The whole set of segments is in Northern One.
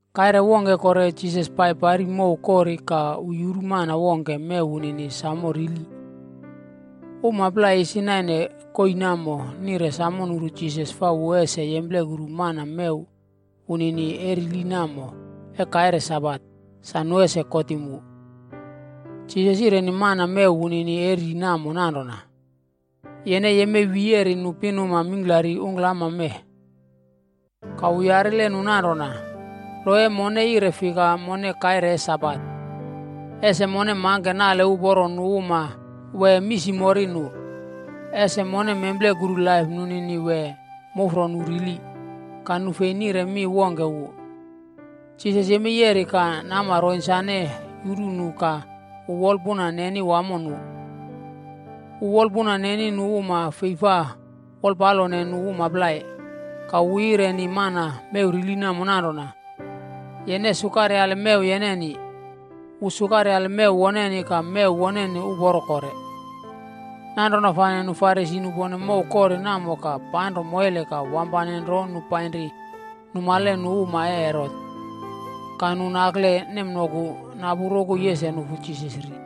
Kaire wongke kore Jisas pai pari mow kori ka wu yuru mana wongke mew wunini samo rili. Uma plai isi naine koii namo nire samo nuru Jisas fa wu ese yemplekuru mana mew wunini e rili namo e kaire Sabat, sa nu ese kotim wu. Jisas yireni mana mew wunini e ri namo nanrona, “Yene yemei wiyeri nu pinuma mingklari ungklama mee.” Ka wu yarile nu nanrona, “Lo e mone yire fika mone kaire e Sabat? Ese mone mangke nale uporo nu uma wee misimori nu? Ese mone memplekuru laip nunini wee mufro nu rili?” Ka nu fei nire mi wongke wu. Jisas yemei yeri ka nama ronsane yuru nu ka wu wolpuna neni wamo nu. Wu wolpuna neni nu uma fei fa wolpalone nu uma plai. Ka wu yireni mana mew rili namo nanrona, “Yene sukaryale mew yeneni.” Wu sukaryale mew woneni ka mew woneni uporo kore. Nanrona fane nu Farisi nupone mow kori namo ka panro moile ka wampane nro nu painri numale nu uma e Herot. Ka nu nakle nemnoku napu rokoi ese nufu Jisas ri.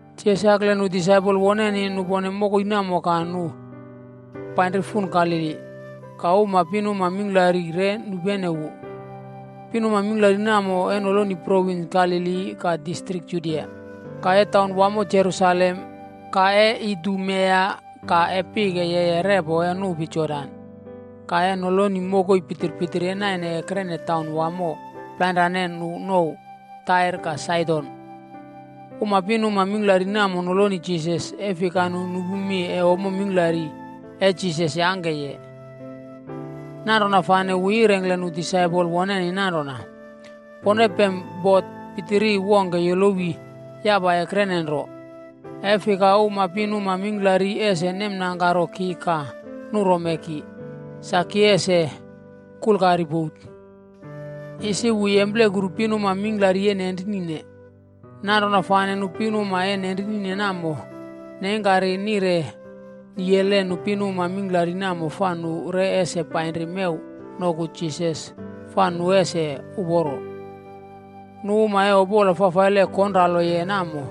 Jisas yakle nu disaipol woneni nupone mokoi namo ka nu painri fun Galili. Ka uma pinuma mingklari re nupenene wu. Pinuma mingklari namo e noloni provins Galili, ka distrik Judia, ka e taunwamo Jerusalem, ka e Idumea, ka e pike yeye repo e nupi Jordan, ka e noloni mokoi pitpitiri e naine ekrene taun wamo plainrane nu nouw Tair ka Saidon. Uma pinuma mingklari namo noloni Jisas, e fika nu nupu mi e ommo mingklari e Jisas yangkeye. Nanrona fane wu yirengkle nu disaipol woneni nanrona, pone pem bot pitiri wongke yolowi yapa ekrene nro, e fika uma pinuma mingklari ese nemnangkaro ki ka nurome ki, sa ki ese kulkari bot. Isi wu yemplekuru pinuma mingklari e nenrinine. Nanrona fane nu pinuma e nenrine namo neingkari nire niyele nu pinuma mingklari namo fa nu re ese painri mew noku Jisas fa nu ese uporo. Nu uma e opola fafaile konraloye namo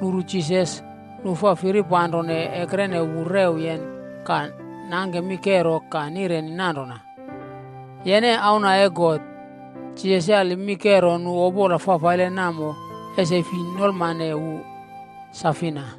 nuru Jisas, nu fa firipanro ekrene wu rewyen ka nangke mi kero ka nireni nanrona, “Yene Auna e God!” Jisas yali mi kero nu opola fafaile namo ese fi nolmane wu sa fina.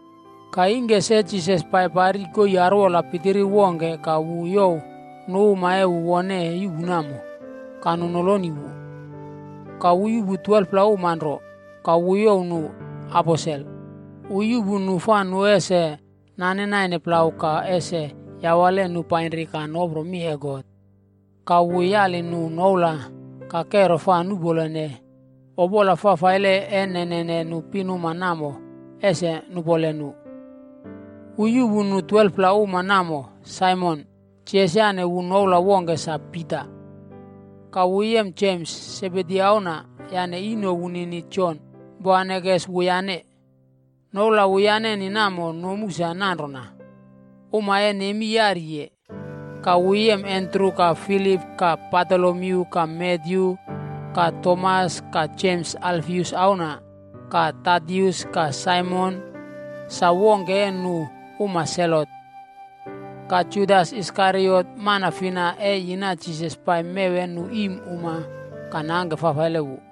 Ka ingke se Jisas pai pari koii arwola pitiri wongke ka wu youw nu uma e wu wone yuꞌpu namo, ka nu noloni wu. Ka wu yuꞌpu 12pla uma nro, ka wu youw nu “aposel.” Wu yuꞌpu nu fa nu ese nane naine plau ka ese yawale nu painri ka nopro mi e God, ka wu yali nu noula ka kero fa nuꞌpolene opola fafaile e nenene nu pinuma namo ese nupole nu. Wu yuꞌpu nu 12pla uma namo Saimon (Jisas yane wu noula wongke sa Pita), ka wu yem Jems, Sebedi auna, yane ino wunini Jon, Jisas yane noula “Boanerges” wuyane. Noula wuyaneni namo nomu sa nanrona Uma e Nemi Yariye. Ka wu yem Andru, ka Filip, ka Batolomyu ka Matyu, ka Tomas, ka Jems Alfius auna, ka Tadius ka Saimon, sa wongke e nu uma Selot, ka Judas Iskariot, mana fina e yina Jisas pai mew e nu iim uma ka nangke fafaile wu.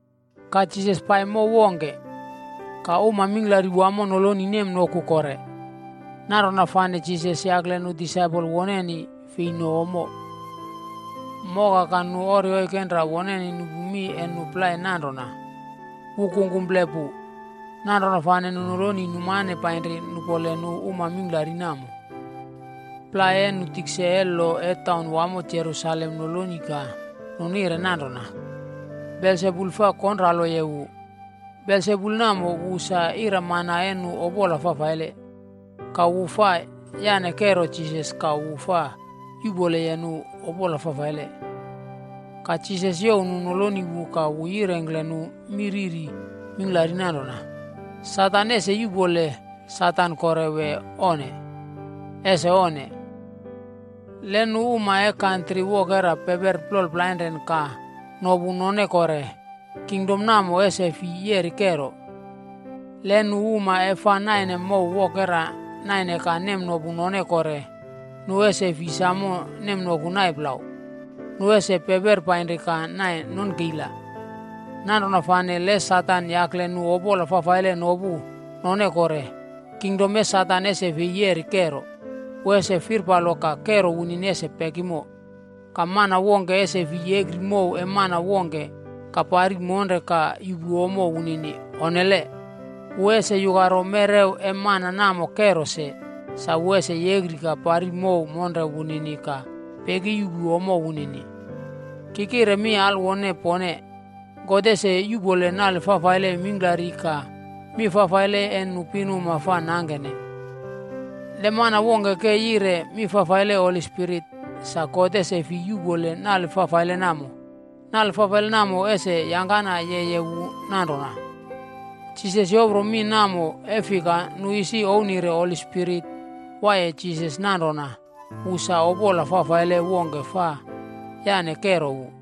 Ka Jisas pai mow wongke. Ka uma mingklari wamo noloni nemnoku kore. Nanrona fane Jisas yakle nu disaipol woneni fei no ommo. Moka ka nu ori oikenra woneni nupu mi e nu plai nanrona “Wu kungkumple pu.” Nanrona fane nu noloni numane painri nupole nu uma mingklari namo. Plai e nu tikse e lo e taunwamo Jerusalem noloni ka nu nire nanrona, “Belsebul fa konraloye wu. Belsebul namo wu sa ira mana e nu opola fafaile, ka wu fa yane kero Jisas ka wu fa yuꞌpoleye nu opola fafaile.” Ka Jisas youw nu noloni wu ka wu yirengkle nu mi riri mingklari nanrona, “Satan ese yuꞌpole Satan kore wee onne? Ese onne! Le nu uma e kantri wokera peperi plol plainre ka nopu none kore, kingdom namo ese fi yeri kero. Le nu uma e fa naine mow wokera naine ka nemnopune none kore, nu ese fi samo nemnoku nai plau, nu ese peperi painri ka nai nonkeila. Nanrona fane le Satan yakle nu opola fafaile nopu none kore, kingdom e Satan ese fei yeri kero. Wu ese firpalo ka kero wunini ese pekimo.” “Mana wongkea ese fi yekri mow e mana wongke ka pari monre ka yuꞌpu ommo wunini. Onnele. Wu ese yukaro mewrew e mana namo kero se, sa wu ese yekri ka pari mow monre wunini ka pekiyuꞌpu ommo wunini.” “Ki kire mi alwone pone, God ese yuꞌpole nale fafaile mingklari ka mi fafaile e nu pinuma fa nangkene. Le mana wongke ke yire mi fafaile Holi Spirit, sa God ese fi yuꞌpole nale fafaile namo. Nale fafaile namo ese yangkana yeye wu nanrona.” Jisas yopro mi namo e fika nu isi ouwnire Holi Spirit waiye Jisas nanrona wu sa opola fafaile wongke fa yane kero wu.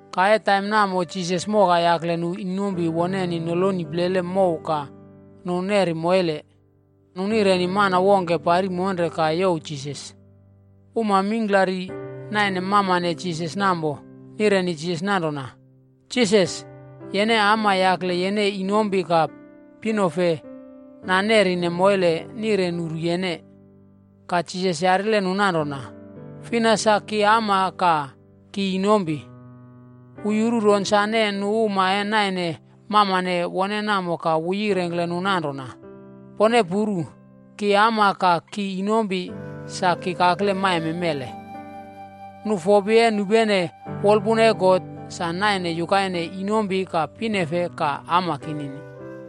Ka e taim namo Jisas moka yakle nu inompi woneni noloni plele mow ka nu neri moile. Nu nireni mana wongke pari monre ka youw Jisas. Uma mingklari naine mamane Jisas namo, nireni Jisas nanrona, “Jisas, yene ama yakle yene inompi ka pinofe nanerine moile nire nuru yene.” Ka Jisas yarile nu nanrona, “Fina sa ki ama ka ki inompi?” Wu yuru ronsane nu uma e naine mamane wone namo ka wu yirengkle nu nanrona, “Pone puru, ki ama ka ki inompi sa ki kakle maime mele. Nu fopi e nupene wolpuna e God, sa naine yukaine inompi ka pinefe ka ama kinini.”